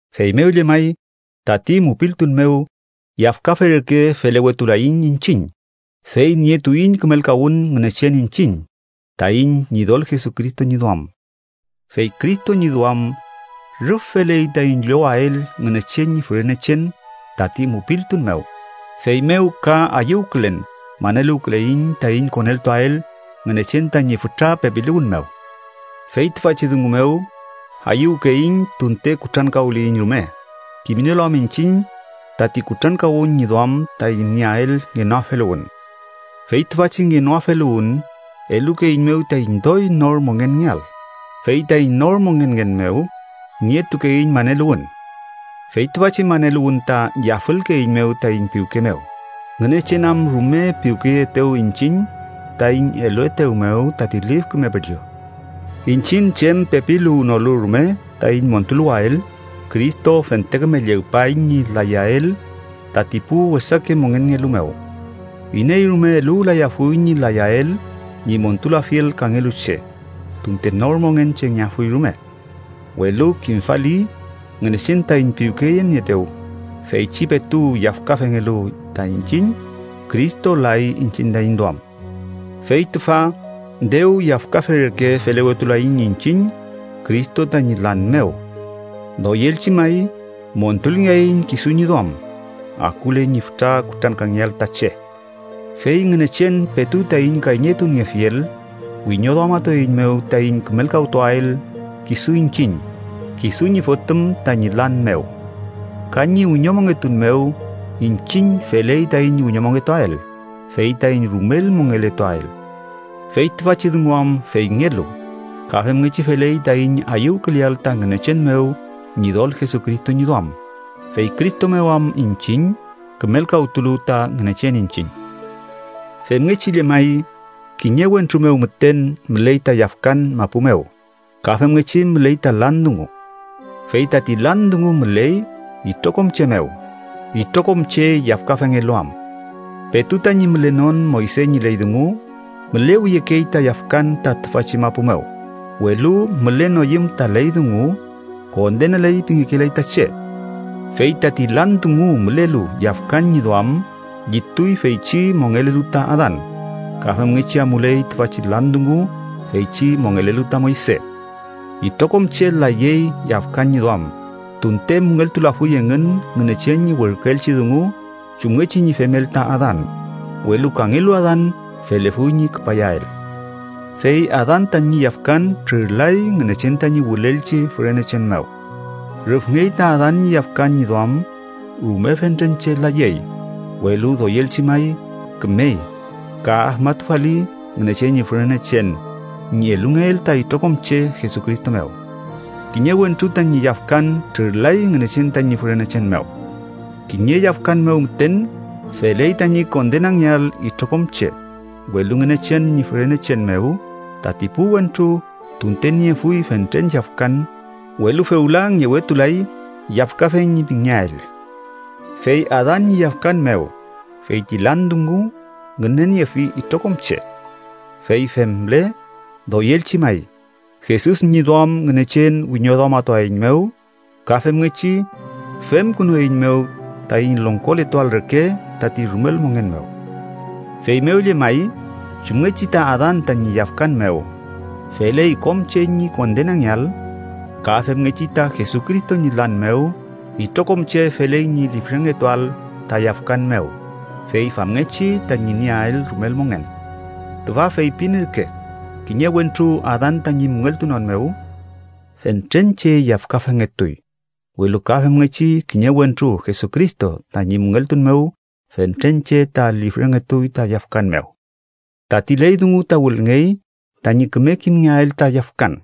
Feymew llemay, tati mupiltun mew yafkafe reke felewetulaiñ iñchiñ, fey nietuiñ kümelkawün Ngünechen iñchiñ, taiñ Ñidol Jesucristo ñi duam. Fey Cristo ñi duam, rüf feley taiñ llowael Ngünechen ñi fürenechen tati mupiltun mew, feymew ka ayüwkülen maneluwküleiñ taiñ koneltuael Ngünechen tañi fütra pepiluwün mew. Fey tüfachi dungu mew, ayüwkeiñ tunte kutrankawliyiñ rume, kimnielu am iñchiñ tati kutrankawün ñi duam taiñ nieael ngenoafeluwün. Fey tüfachi ngenoafeluwün elukeeiñmew taiñ doy nor mongenngeael, fey taiñ nor mongenngen mew, nietukeiñ maneluwün. Fey tüfachi maneluwün ta yafülkeeiñmew taiñ piwke mew, Ngünechen am rume piwkeyeetew iñchiñ taiñ eluetew mew tati Lif Küme Püllü. Iñchiñ chem pepiluwnolu rume taiñ montuluwael, Cristo fente küme llegpay ñi layael tati pu wesake mongenngelu mew. Iney rume eluwlayafuy ñi layael ñi montulafiel kangelu che, tunte nor mongen chengeafuy rume. Welu kimfali Ngünechen taiñ piwkeyenieetew, feychi petu yafkafengelu ta iñchiñ, Cristo lay iñchiñ taiñ duam. Fey tüfa dew yafkafe reke felewetulaiñ iñchiñ Cristo tañi lan mew, doyelchi may montulngeaiñ kisu ñi duam, akule ñi fütra kutrankangeael ta che. Fey Ngünechen, petu taiñ kayñeyetuniefiel, wiñoduamatueiñmew taiñ kümelkawtuael kisu iñchiñ, kisu ñi Fotüm tañi lan mew. Ka ñi wiñomongetun mew iñchiñ feley taiñ wiñomongetuael fey taiñ rumel mongeletuael. Fey tüfachi dungu am feyngelu, ka femngechi feley taiñ ayüwküleael ta Ngünechen mew Ñidol Jesucristo ñi duam, fey Cristo mew am iñchiñ kümelkawtulu ta Ngünechen iñchiñ. Femngechi llemay, kiñe wentru mew müten müley ta yafkan mapu mew ka femngechi müley ta lan dungu. Fey tati lan dungu müley itrokom che mew, itrokom che yafkafengelu am. Petu tañi mülenon Moyse ñi ley dungu, mülewiyekey ta yafkan ta tüfachi mapu mew, welu mülenoyüm ta ley dungu, kondenaley pingekelay ta che. Fey tati lan dungu mülelu yafkan ñi duam llituy feychi mongelelu ta Adan ka femngechi amuley tüfachi lan dungu feychi mongelelu ta Moyse. Itrokom che layey yafkan ñi duam tunte müngeltulafuy engün Ngünechen ñi werküelchi dungu chumngechi ñi femel ta Adan, welu kangelu Adan felefuy ñi küpayael. Fey Adan tañi yafkan trürlay Ngünechen taiñ wülelchi fürenechen mew. Rüfngey ta Adan ñi yafkan ñi duam rume fentren che layey, welu doyelchi may kümey ka afmatufali Ngünechen ñi fürenechen ñi elungeel ta itrokom che Jesucristo mew. Kiñe wentru tañi yafkan trürlay Ngünechen tañi fürenechen mew. Kiñe yafkan mew müten feley tañi kondenangeael itrokom che, welu Ngünechen ñi fürenechen mew tati pu wentru, tunte niefuy fentren yafkan, welu fewla ngewetulay yafkafe ñi pingeael. Fey Adan ñi yafkan mew, feyti lan dungu ngüneniefi itrokom che. Fey femle, doyelchi may, Jesus ñi duam Ngünechen wiñoduamatueiñmew, ka femngechi femkünueiñmew taiñ longkoletuael reke tati rumel mongen mew. Feymew llemay chumngechi ta Adan tañi yafkan mew feley kom che ñi kondenangeael, ka femngechi ta Jesucristo ñi lan mew itrokom che feley ñi lifrengetuael ta yafkan mew, fey famngechi tañi nieael rumel mongen. Tüfa feypin ürke, kiñe wentru Adan tañi müngeltunon mew, fentren che yafkafengetuy, welu ka femngechi, kiñe wentru Jesucristo tañi müngeltun mew, fentren che ta lifrengetuy ta yafkan mew. Tati ley dungu ta wülngey tañi küme kimngeael ta yafkan.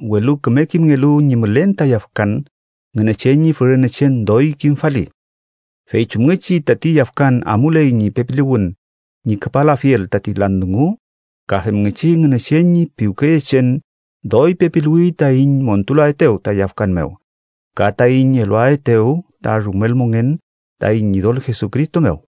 Welu küme kimngelu ñi mülen ta yafkan, Ngünechen ñi fürenechen doy kimfali. Fey chumngechi tati yafkan amuley ñi pepiluwün ñi küpalafiel tati lan dungu, ka femngechi Ngünechen ñi piwkeyechen doy pepiluwi taiñ montulaetew ta yafkan mew ka taiñ eluaetew ta rumel mongen taiñ Ñidol Jesucristo mew.